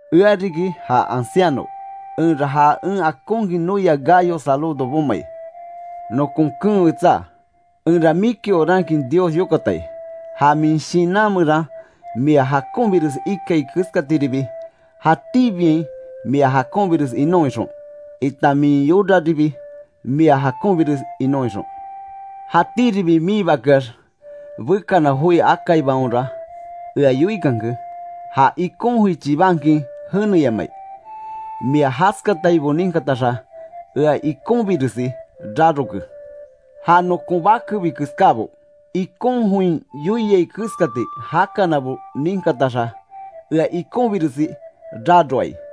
Ea riki ja anciano, enra ja en akonkin noia Gayo saludo bomai. Nokon keen wetsá, enra miki orankin Dios yokatai, ja min shinan meran mia jakonbires ikai keskatiribi, jatíbiain mia jakonbires inon ixon, itan min yoraribi mia jakonbires inon ixon. Jatíribi miibakeax bekana joi akaibaonra ea yoikanke; ja ikon joi chibankin jeneyamai. Mia jaskataibo ninkataxa ea ikonbiresi raroke. Ja nokon bakebi keskábo, ikon join yoiai keskati jakanabo ninkataxa, ea ikonbiresi raroai.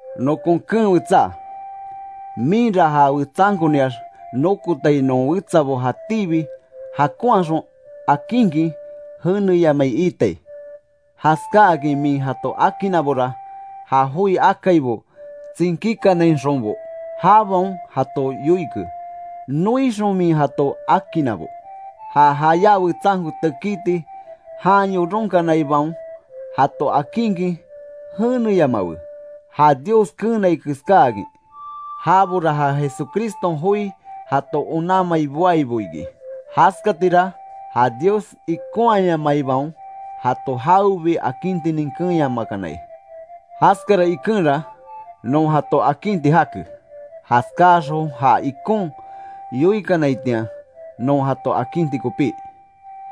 Nokon keen wetsá, minra ja wetsankoniax nokotai non wetsabo jatíbi jakonhaxon akinkin jeneyamai iitai. Jaskáakin min jato akinnabora, ja joi akaibo tsinkíkanainxonbo jabaon jato yoike, noixon min jato akinnabo. Ja jayá wetsanko tekiti jan yoronkanaibaon jato akinkin jeneyamawe, ja Dios keenai keskáakin. Jabora ja Jesucriston joi jato onanmai boaibo iki. Jaskatira ja Dios ikonhayamaibaon jato jawebi akintinin keenyamakanai. Jaskara ikenra, non jato akinti jake, jaskáaxon ja ikon yoikanaitian, non jato akinti kopí.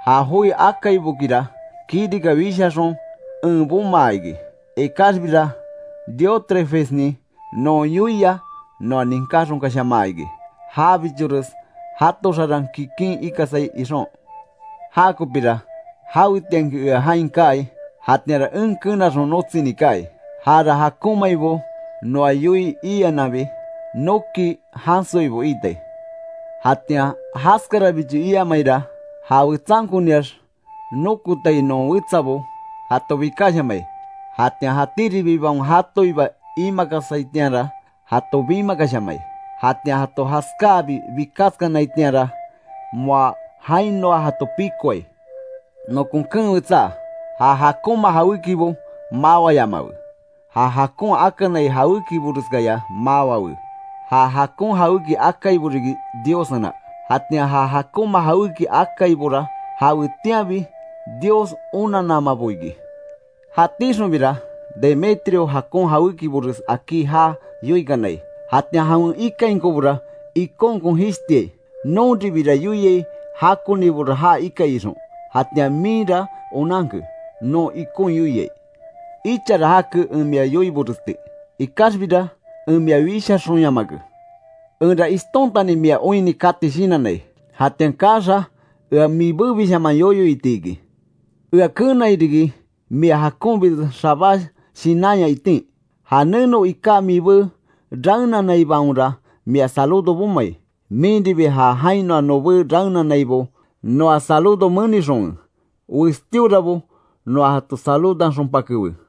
Ja joi akaibokira kirika wishaxon en bomaa iki, ikaxbira Diótrefesnin non yoia noa ninkáxonkashamaa iki, jabichores jato xaran kikin ikasai ixon. Jakopira, jawetianki ea jain kaai, jatianra en kenaxon notsini kaai. Jara jakonmaibo noa yoii iananbi, noki jansoibo iitai. Jatian jaskarabicho iamaira, ja wetsankoniax nokotai non wetsabo, jato bikashamai. Jatian jatíribibaon jatoiba imakasaitianra, jato bimakashamai; jatian jato jaskáabi bikaskanaitianra, moa jainoa jato pikoai. Nokon keen wetsá, ja jakonma jawékibo mawayamawe. Ja jakon akanai jawékiboreskaya mawawe. Ja jakon jawéki akaibo riki Diossena, jatian ja jakonma jawéki akaibora, jawetianbi Dios onananmabo iki. Jatíxonbira Demetrio jakon jawékibores akí jaa yoikanai, jatian jawen ikainkobora ikonkon jishtiai. Nonribira yoiai jakonibora ja ikai ixon, jatian minra onanke, non ikon yoiai. Ichara jake en mia yoiboresti, ikaxbira en mia wishaxonyamake. Enra ishtontani mia oinni kati shinannai, jatian kaaxa ea mibébishaman yoyo iti iki. Ea keenai riki, mia jakonbires xabá shinanya itin. Ja neno iká mibé raenanaibaonra mia saludo bomai. Minribi ja jainoa nobé raenanaibo noa saludo menixonwe, westíorabo noa jato saludanxonpakewe.